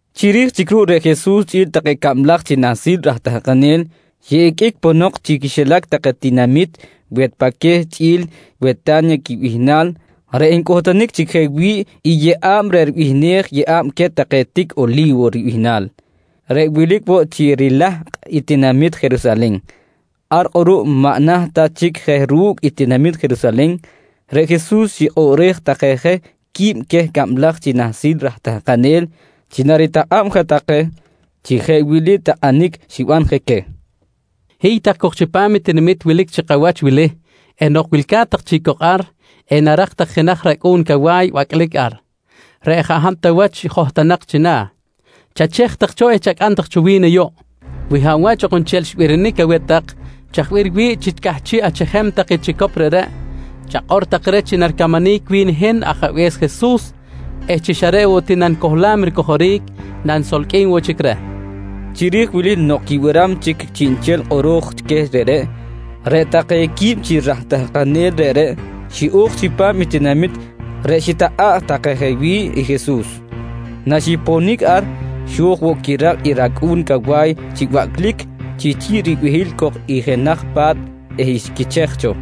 Chiri̱j chic ruꞌ reꞌ Jesus chꞌi̱l take cablaj chi nahsil raj tahkanel xiꞌiqꞌuic ponok chi quixilac take tinamit Wetpaqueh chꞌi̱l i Weta̱nya quibihnal reꞌ ncꞌutunic chic je wi̱ꞌ i yeꞌa̱b reꞌ ribihnej “Yeꞌa̱b queh take tic Oli̱wo ribihnal”, reꞌ wilic woꞌ chi rilahkꞌ i tinamit Jerusalen. Ar kꞌuruꞌ maꞌ naht ta chic je ru̱cꞌ i tinamit Jerusalen, reꞌ Jesus xikꞌoꞌrej take je qui̱b queh cablaj chi nahsil raj tahkanel chi naritakꞌa̱b je take chi jeꞌ wili takꞌanic xiban queh: «Hiy tak cok chipam i tinamit wilic chi kawach wili eh nok wilca̱t tak chic cok ar, enarak tak jenaj racꞌu̱n cawa̱y bacꞌlic ar, reꞌ jaꞌ hab ta wach johtonak china̱. Chachej tak cho eh chacꞌam tak cho wi̱n ayuꞌ. Wi hab wach ok nchel xbirinic aweh tak chaj bih riwi̱ꞌ chi cꞌahchiꞌ achejem tak i chicop reꞌreꞌ, chakꞌor tak reh chi naricamanic wi̱n hin Ajabe̱s Jesus eh chi xa reꞌ woꞌ ti nanicohlam ricojoric nanisolqꞌuim woꞌ chic reh, nqui Jesus. Chiri̱j wili nok quibiram chic chiꞌnchel kꞌoro̱j queh reꞌreꞌ, reꞌ take quib chi raj tahkanel reꞌreꞌ xiꞌo̱j chipam i tinamit reꞌ xitakꞌa̱ꞌ take je wi̱ꞌ i Jesus. Naxiponic ar, xo̱j woꞌ quirak i racꞌu̱n cawa̱y chi bacꞌlic chi chi̱ꞌ ribehil cok i jenaj pa̱t eh xquichej cho.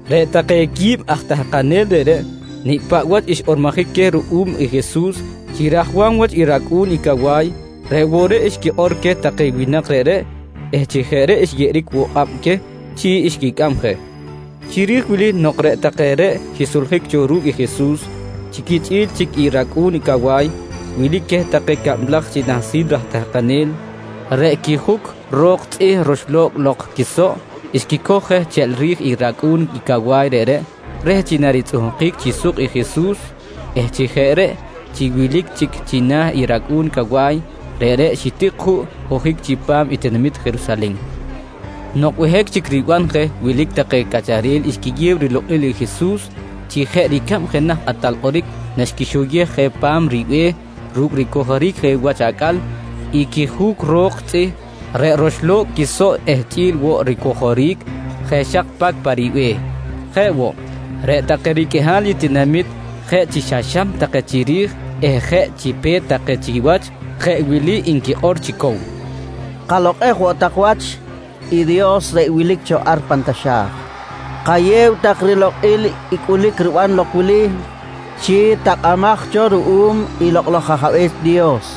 Reꞌ take qui̱b aj tahkanel reꞌreꞌ nicꞌ paꞌ wach xkꞌormojic queh ruꞌum i Jesus chi rajwam wach i racꞌu̱n i cawa̱y, reꞌ woꞌ reꞌ xquikꞌor queh take winak reꞌreꞌ eh chi jeꞌ reꞌ xyeꞌeric woꞌ kꞌab queh chi xquicꞌam je. Chiri̱j wili nok reꞌ take reꞌ xisoljic cho ru̱cꞌ i Jesus chi quichꞌi̱l chic i racꞌu̱n cawa̱y, wilic queh take cablaj chi nahsil raj tahkanel, reꞌ quijuc ro̱k tzꞌih roxlo̱cꞌ lok quisoꞌ, xquicoj je cheꞌl ri̱j i racꞌu̱n i cawa̱y reꞌreꞌ reh chi naritzꞌuhkic chi suk i Jesus eh chi jeꞌ reꞌ chi wilic chic china̱ i racꞌu̱n cawa̱y, reꞌreꞌ xitic juꞌ ojic chipam i tinamit Jerusalen. Nok behic chic riban je, wilic take cꞌacharel xquiyew rilokꞌil i Jesus chi jeꞌ ricab jenaj kꞌatal kꞌoric naxquixoyej je pa̱m ribe̱h ru̱cꞌ ricojoric je wach acꞌal i quijuc ro̱k tzꞌih reꞌ roxlo̱cꞌ lok quisoꞌ eh chꞌi̱l woꞌ ricojoric je xak pacꞌ pa ribe̱h. Jeꞌ woꞌ, reꞌ take riqꞌuihal i tinamit jeꞌ chi xam take chiri̱j eh jeꞌ chi pe̱t take chiwach jeꞌ wili nquikꞌor chi cow: «Kalokꞌej woꞌ tak wach i Dios reꞌ wilic cho ar pan taxa̱j. Kayew tak rilokꞌil i cꞌulic riban lok wili chi takꞌamaj cho ruꞌum i Lokꞌ laj Ajabe̱s Dios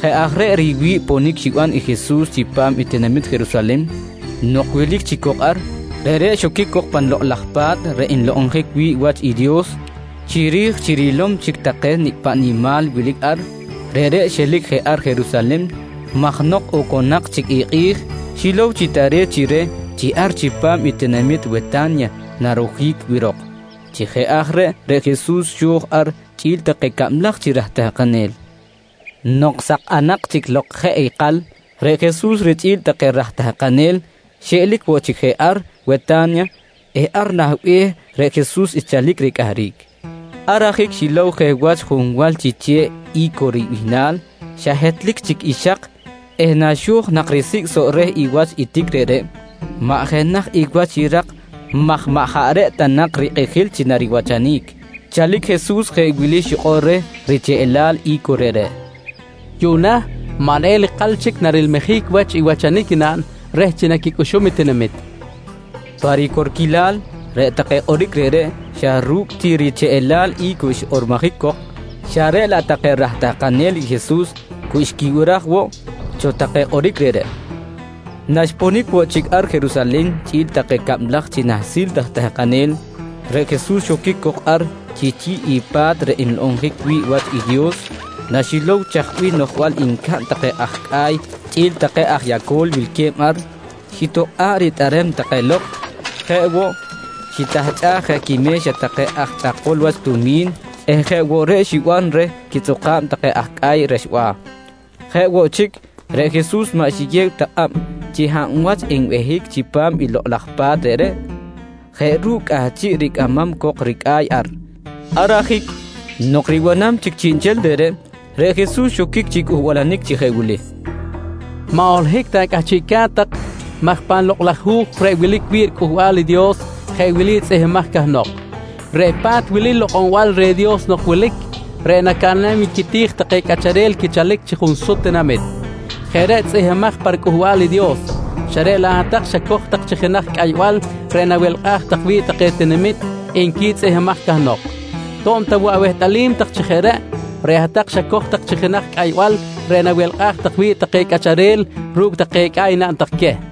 Jeꞌ aj reꞌ riwi̱ꞌ ponic xiban i Jesus chipam i tinamit Jerusalen. Nok wilic chic cok ar, reꞌreꞌ xoquic cok pan Lokꞌ laj Pa̱t reꞌ nlokꞌonjic wi̱ꞌ wach i Dios. Chiri̱j chi rilom chic take nicꞌ paꞌ nimal wilic ar, reꞌreꞌ xelic je ar Jerusalen maj nok oconak chic i kꞌi̱j, xilow chi tare̱t chi reh chi ar chipam i tinamit Weta̱nya narojic wirok. Chi jeꞌ aj reꞌ, reꞌ Jesus xo̱j ar chꞌi̱l take cablaj chi raj tahkanel. Nok sakꞌanak chic lok jeꞌ ikal, reꞌ Jesus richꞌi̱l take raj tahkanel xiꞌelic woꞌ chic je ar Weta̱nya eh ar nah be̱h reꞌ Jesus xchalic ricꞌahric. Ar ajic xilow je wach junwal chi che̱ꞌ I̱co ribihnal xa hetlic chic i xak eh naxo̱j nak risicꞌ soꞌ reh i wach i tic reꞌreꞌ, maꞌ jenaj i wach xirak maj maꞌ jaꞌ reꞌ ta nak rikꞌijil chi nariwachanic. Chalic Jesus jeꞌ wili xikꞌor reh richeꞌlal i̱co reꞌreꞌ: «Yuꞌna maꞌ neꞌel ikal chic narilmijic wach i wachanic naꞌn reh chi naquicꞌuxum i tinamit, nqui reh. Pa ricorquilal, reꞌ take kꞌoric reꞌreꞌ xa ru̱cꞌ ti richeꞌlal i̱co xkꞌormojic cok, xa reꞌ laꞌ take raj tahkanel i Jesus cu xquibiraj woꞌ cho take kꞌoric reꞌreꞌ. Naxponic woꞌ chic ar Jerusalen chꞌi̱l take cablaj chi nahsil raj tahkanel, reꞌ Jesus xoquic cok ar chi chi̱ꞌ i pa̱t reꞌ nlokꞌonjic wi̱ꞌ wach i Dios. Naxilow chaj bih noꞌjbal ncaꞌn take aj cꞌa̱y chꞌi̱l take aj yaco̱l wilque̱b ar, xitokꞌa̱ꞌ ritꞌerem take lok. Jeꞌ woꞌ, xitahchꞌaj je quime̱xa take aj chꞌakol wach tumi̱n eh jeꞌ woꞌ reꞌ xiban reh quitzꞌuka̱b take aj cꞌa̱y rexba̱. Jeꞌ woꞌ chic, reꞌ Jesus maꞌ xiyew ta kꞌab chi hab wach enbehic chipam i lokꞌ laj Pa̱t reꞌreꞌ, jeꞌ ru̱cꞌ cꞌahchiꞌ ricꞌamam cok ricꞌa̱y ar. Ar ajic, nok ribanam chic chiꞌnchel reꞌreꞌ, reꞌ Jesus xoquic chi cꞌuhbalanic chi jeꞌ wili: «Maꞌ holohic ta cꞌahchiꞌca̱t tak maj pan Lokꞌ laj Hu̱j reꞌ wilic wi̱ꞌ riCꞌuhbal i Dios jeꞌ wili tzꞌihmbimaj cahnok: “Reꞌ pa̱t wili lokꞌonbal reh Dios nok wilic reꞌ nacaꞌnam wi̱ꞌ quiti̱j take cꞌacharel quichalic chi junsut tinamit. Jeꞌ reꞌ tzꞌihmbimaj pa riCꞌuhbal i Dios, xa reꞌ laꞌ hat-tak xacoj tak chi jenaj cꞌaybal reꞌ nawelkꞌaj tak wi̱ꞌ take tinamit, nqui tzꞌihmbimaj cahnok. «To̱b ta woꞌ awehtꞌalim tak chi jeꞌ reꞌ, reꞌ hat-tak xacoj tak chi jenaj cꞌaybal reꞌ nawelkꞌaj tak wi̱ꞌ take cꞌacharel ru̱cꞌ take cꞌa̱y naꞌn tak queh, nqui Jesus.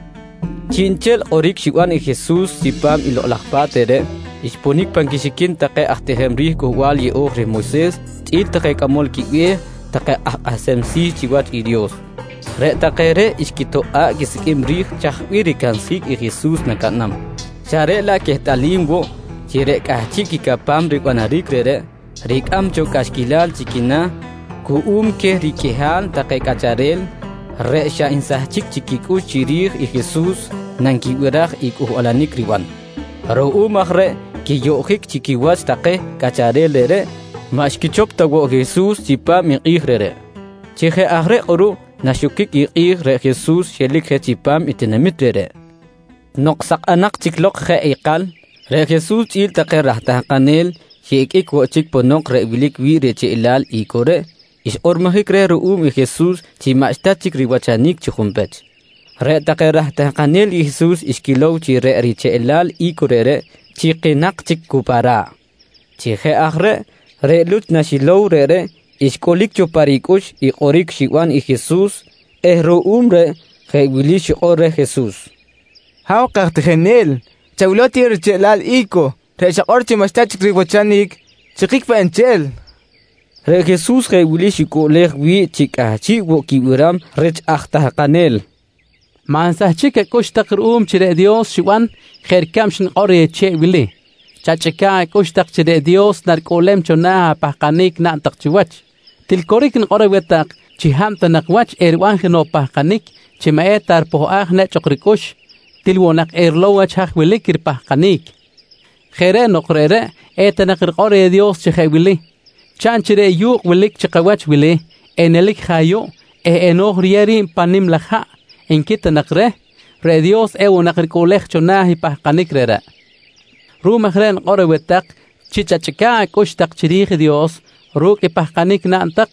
Chiꞌnchel kꞌoric xiban i Jesus chipam i lokꞌ laj Pa̱t reꞌreꞌ xponic pan quixiquin take aj tijem ri̱j Cꞌuhbal Yeꞌo̱j reh Moyses chꞌi̱l take cꞌamol quibe̱h take aj kꞌahsem si̱ chiwach i Dios, reꞌ take reꞌ xquitokꞌa̱ꞌ quisiqꞌuim ri̱j chaj bih ricansjic i Jesus nacaꞌnam xa reꞌ laꞌ quehtꞌalim woꞌ chi reꞌ cꞌahchiꞌ quicapam ribanaric reꞌreꞌ, ricꞌam cho cꞌaxquilal chi quina̱ cuꞌum queh riqꞌuihal take cꞌacharel reꞌ xa nsahchic chic quicꞌux chiri̱j i Jesus nanquibiraj i cꞌuhbalanic riban. Ruꞌum aj reh quiyoꞌjic chi quiwach take cꞌacharel reꞌreꞌ, maꞌ xquichop ta woꞌ i Jesus chipam i kꞌi̱j reꞌreꞌ. Chi jeꞌ aj reꞌ kꞌuruꞌ naxoquic i kꞌi̱j, reꞌ Jesus xelic je chipam i tinamit reꞌreꞌ. Nok sakꞌanak chic lok jeꞌ ikal, reꞌ Jesus chꞌi̱l take raj tahkanel xiꞌiqꞌuic woꞌ chic ponok reꞌ wilic wi̱ꞌ i richeꞌlal i̱co reꞌ xkꞌormojic reh ruꞌum i Jesus chi maꞌxta chic riwachanic chi junpech. Reꞌ take raj tahkanel i Jesus xquilow chi reꞌ richeꞌlal i̱co reꞌreꞌ chikinak chic cu pa ra̱ꞌ. Chi jeꞌ aj reꞌ, reꞌ Luch naxilow reꞌreꞌ xcꞌulic cho pa ricꞌux i kꞌoric xiban i Jesus eh ruꞌum reꞌ jeꞌ wili xikꞌor reh Jesus: «Ha̱w kaj tijinel, chawilow ti i richeꞌlal i̱co reꞌ xakꞌor chi maꞌxta chic riwachanic, chikic peꞌ nchel! nqui reh. Reꞌ Jesus jeꞌ wili xicꞌuꞌlej wi̱ꞌ chi cꞌahchiꞌ woꞌ quibiram rich aj tahkanel: «Maꞌ nsahchic acꞌux tak ruꞌum chi reꞌ Dios xiban jeꞌ ricab xnikꞌor reh che̱ꞌ wili. Chachꞌica̱ꞌ acꞌux tak chi reꞌ Dios naricꞌuꞌlem cho na̱ apahkanic naꞌn tak chiwach. Til coric nikꞌor aweh tak chi hab ta nak wach eriban jenoꞌ pahkanic chi maꞌ eta ripohꞌaj nechꞌ ok ricꞌux, til woꞌ nak erilow wach haj wilic i ripahkanic. Jeꞌ reꞌ nok reꞌreꞌ eta nak rikꞌor reh Dios chi jeꞌ wili: ‹Chaꞌn chi reꞌ yu̱kꞌ wilic chi kawach wili, enelic je ayuꞌ eh eno̱j riyew ri̱b pan nim laj haꞌ, nqui ta nak reh, reꞌ Dios ewoꞌ nak ricꞌuꞌlej cho na̱ i pahkanic reꞌreꞌ. Ruꞌum aj reꞌ nikꞌor aweh tak chi chachꞌica̱ꞌ acꞌux tak chiri̱j i Dios ru̱cꞌ apahkanic tak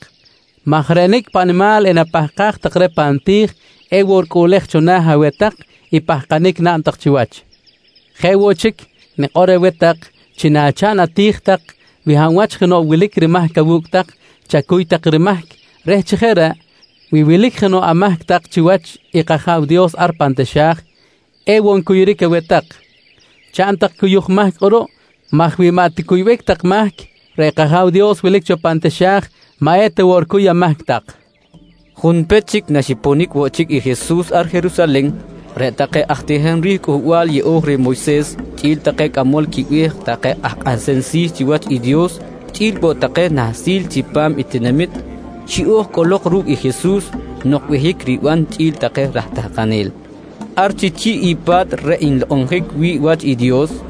maj reꞌ nicꞌ paꞌ nimal enapahkaj tak reh pan ti̱j, ewoꞌ ricꞌuꞌlej cho na̱ aweh tak i pahkanic naꞌn tak chiwach. Jeꞌ woꞌ chic, nikꞌor woꞌ aweh tak chi nachaꞌn ati̱j tak, wi hab wach jenoꞌ wilic rimahc awu̱cꞌ tak, chacuy tak rimahc reh chi jeꞌ reꞌ, wi wilic jenoꞌ amahc tak chiwach i kAja̱w Dios ar pan taxa̱j, ewoꞌ ncuyuric aweh tak. Chaꞌn tak cuyuj mahc kꞌuruꞌ maj wi maꞌ ticuybic tak mahc, reꞌ kAja̱w Dios wilic cho pan taxa̱j maꞌ eta woꞌ ricuy amahc tak, nqui Jesus. Junpech chic naxponic woꞌ chic i Jesus ar Jerusalen, reꞌ take aj tijem ri̱j Cꞌuhbal Yeꞌo̱j reh Moyses chꞌi̱l take cꞌamol quibe̱h take aj kꞌahsem si̱ chiwach i Dios chꞌi̱l woꞌ take nahsil chipam tinamit, xiꞌo̱j cꞌolok ru̱cꞌ i Jesus nok behic riban chꞌi̱l take raj tahkanel ar chi chi̱ꞌ i pa̱t reꞌ nlokꞌonjic wi̱ꞌ wach i Dios.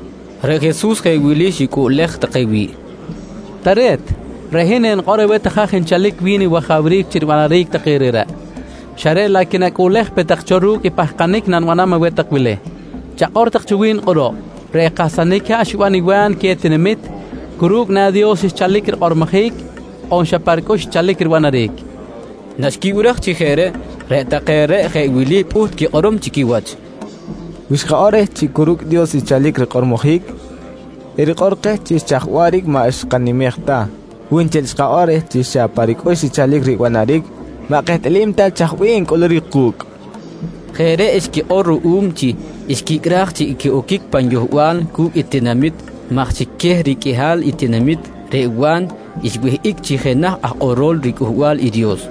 Reꞌ Jesus jeꞌ wili xicꞌuꞌlej take wi̱ꞌ: «Tare̱t, reꞌ hin enikꞌor aweh tak haj nchalic wi̱n i wajawric chi ribanaric take reꞌreꞌ, xa reꞌ laꞌ quinacꞌuꞌlej pe tak cho ru̱cꞌ i pahkanic nanibanam aweh tak wili: Chakꞌor tak cho wi̱n kꞌuruꞌ, reꞌ kahsanic haꞌ xiban i Wa̱n queh tinamit, cu ru̱cꞌ na Dios xchalic rikꞌormojic on xa pa ricꞌux xchalic ribanaric? nqui queh. Naxquibiraj chi jeꞌ reꞌ, reꞌ take reꞌ jeꞌ wili pꞌuht quikꞌorom chi quiwach: «Wi xkakꞌor reh chi cu ru̱cꞌ Dios xchalic rikꞌormojic, erikꞌor keh chi chaj waꞌric maꞌ xkanimej ta. Wi nchel xkakꞌor reh chi xa pa ricꞌux xchalic ribanaric, maꞌ kehtꞌalim ta chaj bih encꞌuluric ku̱cꞌ? nqui take chi quiwach. Jeꞌ reꞌ xquikꞌor ruꞌum chi xquicꞌraj chi equiꞌoquic pan yohbal cu̱cꞌ i tinamit maj chi queh riqꞌuihal i tinamit reꞌ Wa̱n xwihꞌic chi jenaj aj kꞌorol riCꞌuhbal i Dios.